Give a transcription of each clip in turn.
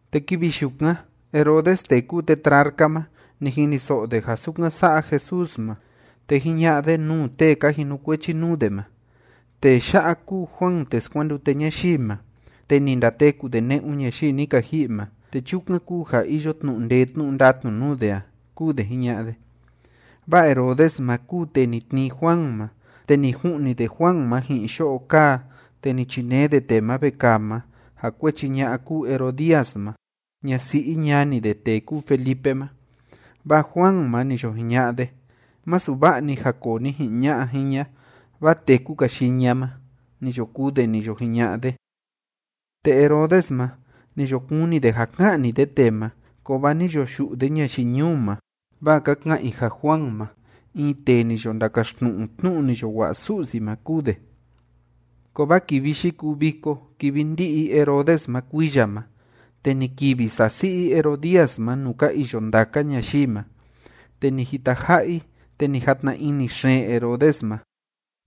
Te kivi yukan Herodes tee kúu tetrarca ma, ni jiniso'o de ja sukan sa'a Jesús ma. Te jiña'a de nuu tee ka jinukuechi nuu de ma: ―Tee ya'a kúu Juan tee skuandute ñayii ma, te ni ndateku de ne'un ñayii ni ka ji'i ma, te chukan kúu ja iyo tnu'u ndee tnu'u ndatnu nuu de a ―kúu de jiña'a de. Vaa Herodes ma kúu tee ni tnii Juan ma, te ni ju'ni de Juan ma ji'in yo'o kaa, te ni chinee de tee ma vekaa ma, ja kuechi ña'a kúu Herodías ma, ñasi'i ñani de tee kúu Felipe ma. Vaa Juan ma, ni yo jiña'a de: ―Masu va'a‑ni ja koo ni ji'in ña'a jiña, vaa téku‑ka yii ña ma ―ni yo kuu de ni yo jiña'a de. Te Herodes ma, ni yo kuni de ja ka'ni de tee ma, kovaa ni yo yu'u de ñayii ñuu ma, vaa ka ka'an i ja Juan ma, in tee ni yo ndakaxtnu'u tnu'u ni yo wa'a Su'si ma kúu de. Kovaa kivi yikuu viko kivi ndí'i Herodes ma kuiya ma, te ni kivi sasi'i Herodías ma nuu ka iyo ndaka ñayii ma, te ni jitaja'a i, te ni jatna ini xeen Herodes ma.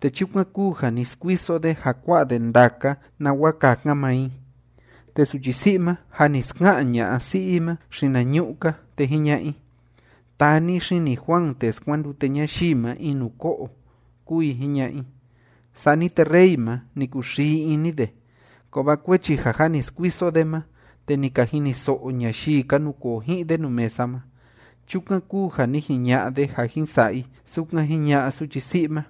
Te chukan kúu ja ni skuiso de ja kua'a de ndaka nawa kakan maa i. Te suchi si'i ma, jâ ni ska'an ña'a si'i i ma xinañu'u‑ka, te jiña'a i: ―Taa ni xini Juan tee skuandute ñayii ma in nuu ko'o ―kúu i jiña'a i. Sani te rey ma, ni kuxii ini de, kovaa kuechi ja jâ ni skuiso de ma te ni ka jiniso'o ñayii ka nukoo ji'in de nuu mesa ma, chukan kúu ja ni jiña'a de ja jin sa'a i sukan jiña'a suchi si'i ma.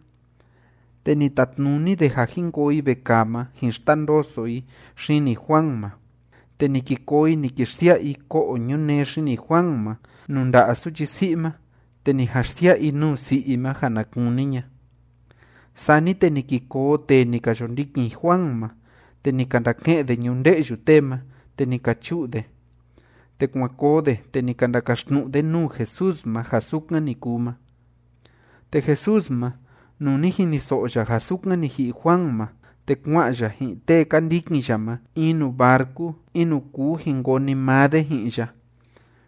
Te ni tatnuni de ja jin koo i vekaa ma jin xtandoso i xini Juan ma. Te ni ki koo i ni ki xsia'a i ko'o ñunee xini Juan ma nuu nda'a suchi si'i ma, te ni jan xsia'a i nuu si'i i ma ja na kuni ña. Sani te ni ki koo tee ni ka yo ndikin Juan ma, te ni ka ndake'en de ñunde'yu tee ma, te ni ka chu'u de, te kuan koo de, te ni ka ndakaxtnu'u de nuu Jesús ma ja sukan ni kuu ma. Te Jesús ma, nuu ni jiniso'o ya ja sukan ni ji'i Juan ma, te kua'an ya ji'in tee ka ndikin ya ma in nuu barcu in nuu kuu jin koo‑ni maa de ji'in ya.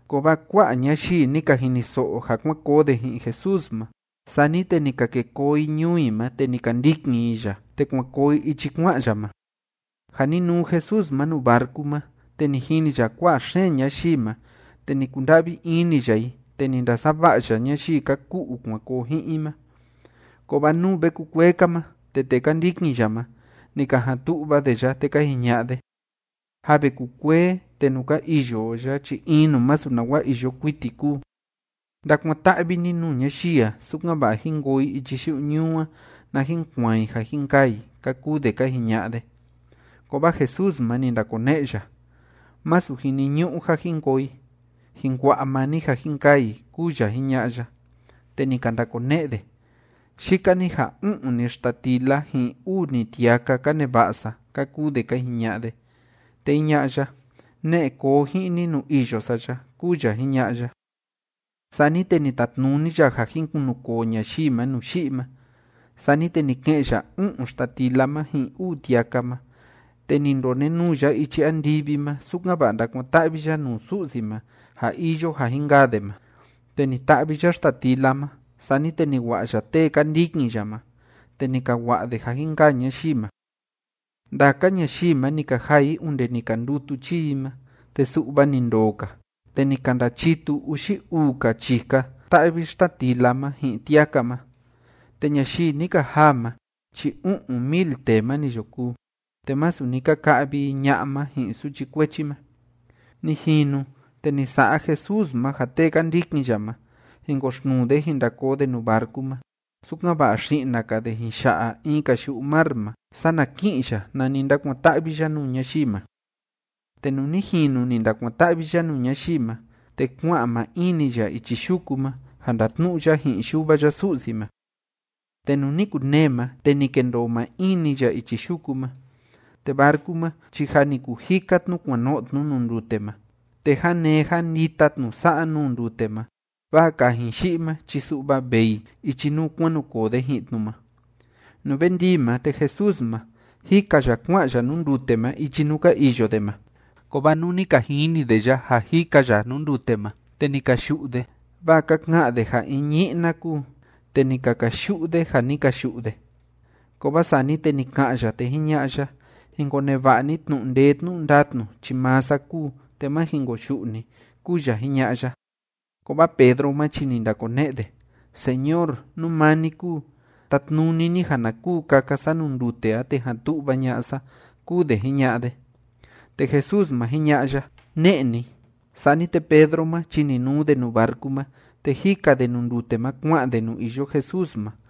Kovaa kua'a ñayii ni ka jiniso'o ja kuan koo de ji'in Jesús ma. Sani te ni ka ke koo i ñuu i ma, te ni ka ndikin i ya, te kuan koo i ichi kua'an ya ma. Ja ni nuu Jesús ma nuu barcu ma, te ni jini ya kua'a xeen ñayii ma, te ni kunda'vi ini ya i, te ni ndasava'a ya ñayii ka ku'u kuan koo ji'in i ma. Kovaa nuu ve kukuee‑ka ma, te tee ka ndikin ya ma, ni ka jan tu'va de ya, te ka jiña'a de: ―Jâ ve kukuee, te nuu ka iyo o ya chi in nuu masu nawa iyo kuiti kúu. Ndakuan‑ta'vi ni nuu ñayii a, sukan‑va'a jín koo i ichi yu'u ñuu a, na jin kuaan i ja jin kaa i ―ka kuu de ka jiña'a de. Kovaa Jesús ma, ni ndakone'e ya: ―Masu jiniñu'u ja jin koo i. Jin kua'a maa ni ja jin kaa i ―kúu ya jiña'a ya. Te ni ka ndakone'e de: ―Yika‑ni ja u'un‑ni xtatila ji'in uu‑ni tiaka ka neva'a sa ―ka kuu de ka jiña'a de. Te jiña'a ya: ―Ne'e koo ji'in ni nuu iyo sa ya ―kúu ya jiña'a ya. Sani te ni tatnuni ya ja jin kunukoo ñayii ma nuu yi'i ma. Sani te ni ke'en ya u'un xtatila ma ji'in uu tiaka ma, te ni ndonenuu ya ichi andivi ma, sukan‑va'a ndakuan‑ta'vi ya nuu Su'si ma ja iyo ja jin kaa de ma, te ni ta'vi ya xtatila ma. Sani te ni wa'a ya tee ka ndikin ya ma, te ni ka wa'a de ja jin kaa ñayii ma. Ndaka ñayii ma, ni ka jaa i onde ni ka ndutu chii i ma. Te su'va ni ndoo‑ka, te ni ka ndachitu uxi uu‑ka chika ta'vi xtatila ma ji'in tiaka ma. Te ñayii ni ka jaa ma chi u'un mil tee ma ni yo kúu. Te masu ni ka ka'vi i ña'a ma ji'in suchi kuechi ma. Ni jinu, te ni sa'a Jesús ma ja tee ka ndikin ya ma, jin koxtnuu de jin nda koo de nuu barcu ma, sukan‑va'a xi'na‑ka de jin ya'a in‑ka yu'u mar ma, sana ki'in ya nani ndakuan‑ta'vi ya nuu ñayii ma. Te nuu ni jinu ni ndakuan‑ta'vi ya nuu ñayii ma, te kua'an maa in‑ni ya ichi yuku ma, ja ndatnu'u ya ji'in Yuva ya Su'si ma. Te nuu ni kunee ma, te ni kendoo maa in‑ni ya ichi yuku ma. Te barcu ma chi jâ ni kujika tnu kuan no'o tnu nuu ndute ma. Te jánee jándita tnu sa'a nuu ndute ma, vaa kajin yi'i ma chi su'va vee i ichi nuu kuan nu koo de ji'in tnu ma. Nuu ve ndii ma, te Jesús ma, jika ya kua'an ya nuu ndute ma ichi nuu ka iyo de ma. Kovaa nuu ni ka jini de ya ja jika ya nuu ndute ma, te ni ka yu'u de, vaa ka ka'án de ja in ñi'na kúu, te ni ka kayu'u de ja ni ka yu'u de. Kovaa sani te ni ka'an ya, te jiña'a ya: ―Jin koneva'a ni tnu'u ndee tnu'u ndatnu chi maa sa kúu, te má jin koyu'u ni ―kúu ya jiña'a ya. Kovaa Pedro ma chi ni ndakone'e de: ―Señor, nú maa ni kúu, tatnuni ni ja na kuu kaka sa nuu ndute a te jan tu'va ña'a sa ―kúu de jiña'a de. Te Jesús ma, jiña'a ya: ―Ne'e ni. Sani te Pedro ma chi ni nuu de nuu barcu ma, te jika de nuu ndute ma kua'an de nuu iyo Jesús ma.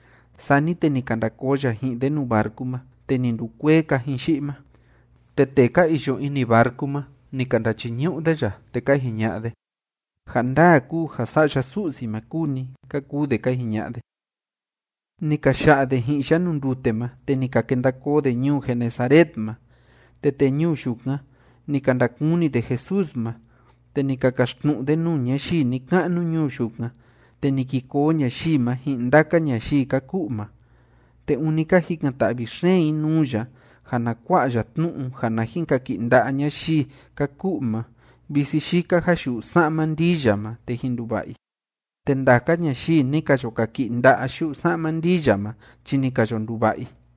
Sani te ni ka nda koo ya ji'in de nuu barcu ma, te ni ndukuee kajin yi'i ma. Te tee ka iyo ini barcu ma, ni ka ndachiñu'u de ya, te ka jiña'a de: ―Ja ndaa kúu ja Sa'ya Su'si ma kúu ni ―ka kuu de ka jiña'a de. Ni ka ya'a de ji'in ya nuu ndute ma, te ni ka kenda koo de ñuu Genesaret ma. Te tee ñuu yukan, ni ka ndakuni de Jesús ma, te ni ka kaxtnu'u de nuu ñayii ni‑ka'nu ñuu yukan, te ni ki koo ñayii ma ji'in ndaka ñayii ka ku'u ma. Te ûni ka jikan‑ta'vi xeen i nuu ya ja na kua'a ya tnu'u ja na jin kaki'i nda'a ñayii ka ku'u ma visi yika ja yu'u sa'ma ndii ya ma te jin nduva'a i. Te ndaka ñayii ni ka yo kaki'i nda'a yu'u sa'ma ndii ya ma chi ni ka yo nduva'a i.